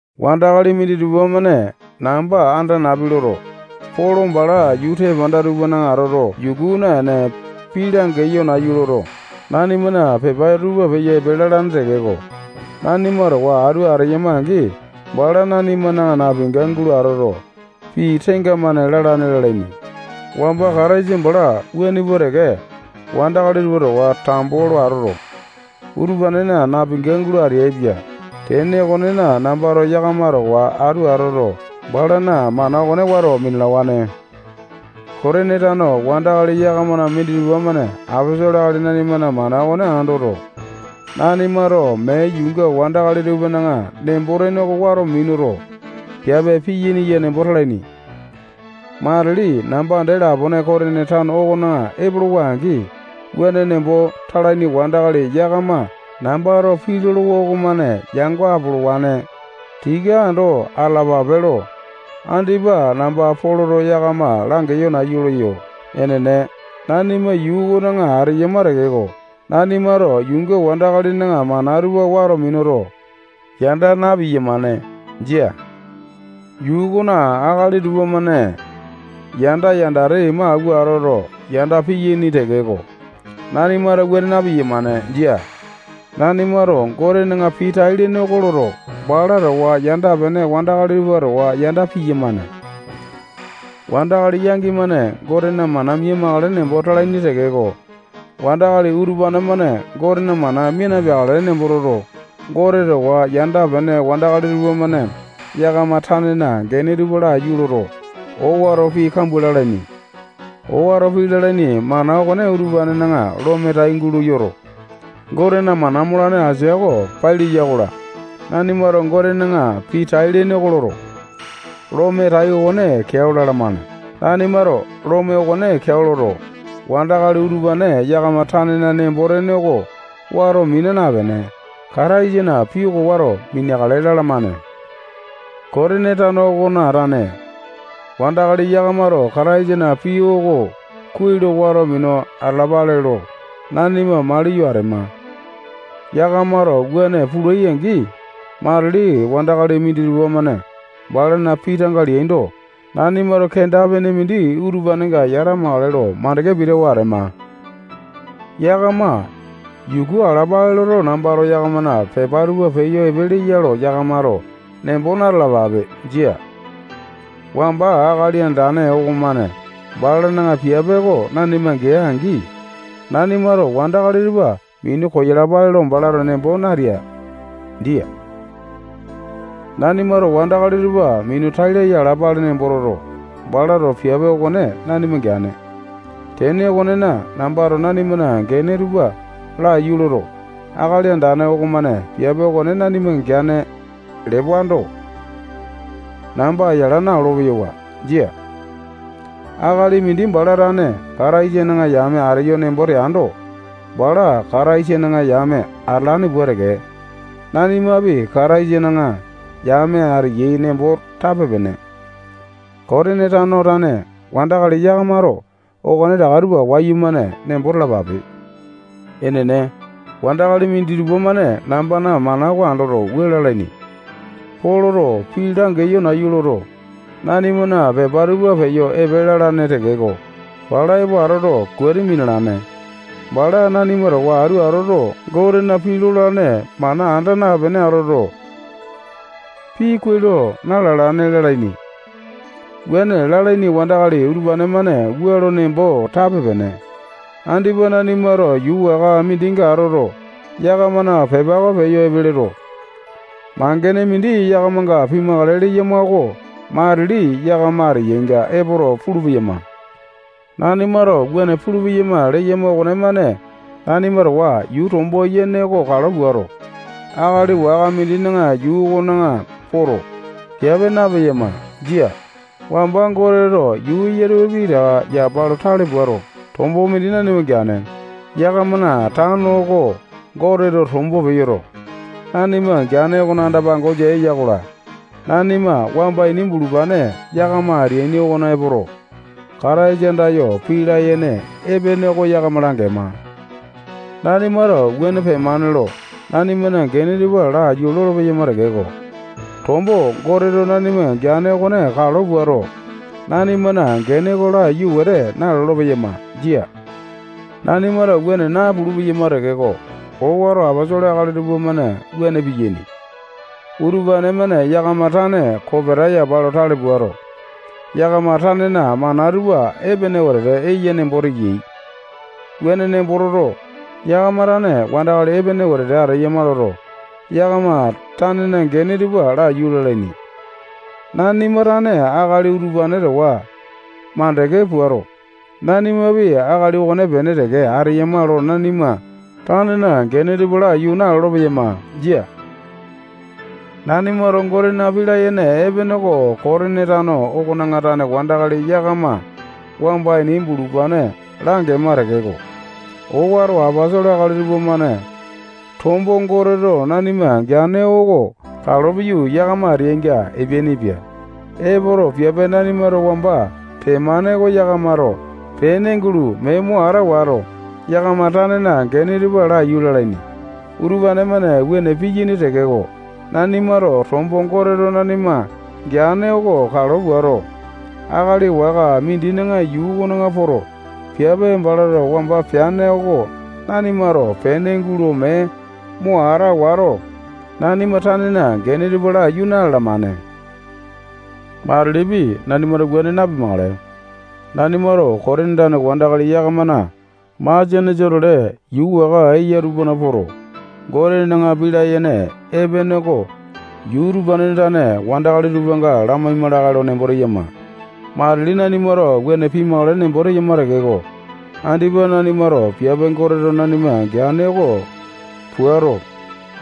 Wandakali minditupa-mane namba anda napi loto, Polo bala yuu tepanda tupana atoto, yuku naene, pii langeyo nayu loto, nanimana pepa tupa peyo epe lalane tekeko, nanima towa atu ateyama-angi, bala nanimana napinga gulo atoto, pii tenga-mane lalane lalaini. Wamba Kataisa bala wuane pua teke, wandakali tupa towa tambo lo atoto, utupanena napinga gulo ateaipia. Tene okonena, nambato yakama towa atu atoto, balana mana okone wato minalawane. Kotini tane wandakali yakamana minditupa-mane aposolo akali nanimana mana okone andoto, nanimato mee yuunga wandakali tupana nembo-tene oko wato minuto, piape piyaini nembo talaini. Matili namba dee lapone Kotini tano okona epolowa-angi, wuane nembo talaini wandakali yakama nambato pii lolowa okomane yango apolowane. Tika ando atalapape lo andipa namba Poloto yakama langeyo nayu leyo. Enene, nanima yuu okona ateyama tekeko, nanimato yuunga wandakalina mana tupa wato minuto, yanda na-piyamane. Jia. Yuu okona akali tupamane yanda, yandate ima awua atoto, yanda piyaini tekeko, nanimato wuane na-piyamane. Jia. Nanimato Gotena pii tai-lene oko loto, bala towa yanda-pene wandakali tupa towa yanda piyamane. Wandakali yangi-mane Gotena mana mia-makale nembo talaini tekeko, wandakali utupane-mane Gotena mana mia napeakale nembo toto, Gote towa yanda-pene wandakali tupamane yakama tanena gene tupa laiyu loto, owato pii kambua lalaini. Owato pii lalaini mana okone utupanena lome tai gulo yoto, Gotena mana molane asia oko pai leya-kola, nanimato Gotena pii tai-lene oko loto, lome tai okone keao lalamane. Nanimato lome okone keao loto, wandakali utupane yakama tanena nembo-tene oko wato mina napene, Kataisana pii oko wato mineakale lalamane. Kotini tano okona tane wandakali yakamato Kataisana pii oko kuai lo wato minu atalapale lo nanima maliyo atema. Yakamato wuane pulai-angi, matili wandakali minditupa-mane balana pii tanga leaindo, nanimato kenda-pene mindi utupanenga yatamakale lo mandeke pitawa ateyama. Yakama yuku alapale loto, nambato yakamana pepa tupa peyo epe leya lo yakamato nembo na-talapape. Jia. Wamba Akali Andane okomane balana piape oko nanima gea-angi, nanimato wandakali tupa minu koyalapale lo balato nembo natea. Jia. Nanimato wandakali tupa minu tai laya alapale nembo toto, balato piape okone nanima geane. Tene okonena, nambato nanimana gene tupa laiyu loto, Akali Andane okomane piape okone nanima geane lewando, namba yala naolo-peyawa. Jia. Akali mindi bala tane Kataisana yame ateyo nembo teando, bala Kataisana yame atalane pua teke, nanimapi Kataisana yame ateyai nembo tape-pene. Kotini tano tane wandakali yakamato okonetaka tupa wayumane nembo talapape. Enene, wandakali minditupa-mane nambana mana oko andoto, wua lalaini: Poloto pii langeyo nayu loto, nanimana pepa tupa peyo epe lalane tekeko, bala epo atoto, kuati minalane. Bala nanima towa atu atoto, Gotena pii lolane mana anda napene atoto, pii kuai lo na-lalane lalaini. Wuane lalaini wandakali utupane-mane wua lo nembo tape-pene: Andipa nanimato yuu waka mindinga atoto, yakamana pepa oko peyo epe loto, mangene mindi yakamanga pimakale leyama oko matili yakama ateyainga epoto, pulu-peyama. Nanimato wuane pulu-peyama leyama okomane nanima towa yuu tombo yene oko kalo puato, akali waka mindina yuu okona poto, piape napeyama. Jia. Wamba Goteto yuu eya tupa pitaka yapa lo tale puato, tombo mindi nanima geane. Yakamana tano oko tombo Goteto nanima geane okona anda-pangosa eya-kola, nanima wamba ini bulupane yakama ateaini okona epoto, Kataisa andayo pii layene epene oko yakama langema. Nanimato wuane pemane lo nanimana gene tupa laiyu lolo-peyama tekeko, tombo Goteto nanima geane okone kalo puato, nanimana gene oko laiyu wete nalolo-peyama. Jia. Nanimato wuane napulu-peyama tekeko, owato aposolo akali tupamane wuane piyaini. Utupane-mane yakama tane kopeta yapa lo tale puato, yakama tanena mana tupa epene wetete eyai nembo teyai. Wuane nembo toto, yakama tane wandakali epene wetete ateyama loto, yakama tanena gene tupa laiyu lalaini. Nanima tane akali utupane towa mandeke puato, nanimapi akali okonepene teke ateyama lo nanima tanena gene tupa laiyu nalolo-peyama. Jia. Nanimato Gotena pii layene epene oko Kotini tano okona tane wandakali yakama wamba ini bulupane langema tekeko, owato aposolo akali tupamane tombo Goteto nanima geane oko kalo piyu, yakama ateyainga epeainipia. Epoto, piape nanimato wamba pemane oko yakamato pene gulo mee mo ata wato, yakama tanena gene tupa laiyu lalaini. Utupane-mane wuane piyaini tekeko, nanimato tombo Goteto nanima geane okone kalo puato, akali waka mindina yuu okona poto, piape balato wamba peane oko nanimato pene gulo mee mo ata wato, nanima tanena gene tupa laiyu na-lalamane. Matilipi, nanimato wuane napimakale. Nanimato Kotini tane wandakali yakamana masianesa-tole yuu waka eya tupana poto, Gotena pii layene epene oko yuu utupanena tane wandakali tupanga lamaima lakae lo nembo teyama. Matili nanimato wuane pimakale nembo teyama tekeko, andipa nanimato piape Goteto nanima geane oko puato,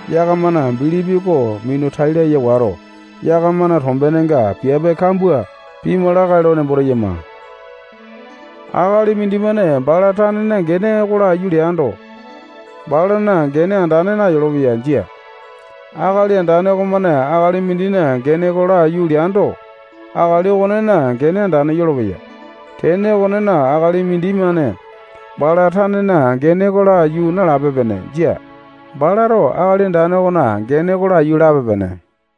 yakamana bilipi oko minu tai laya wato, yakamana tombenenga piape kambua pima lakae lo nembo teyama. Akali mindimane bala tanena gene oko laiyu leando, balana gene andane nayolopeya. Jia. Akali Andane okomane akali mindina gene oko laiyu leando, akali okonena gene andane yolopeya. Tene okonena, akali mindimane bala tanena gene oko laiyu nalape-pene. Jia. Balato Akali Andane okona gene oko laiyu lape-pene.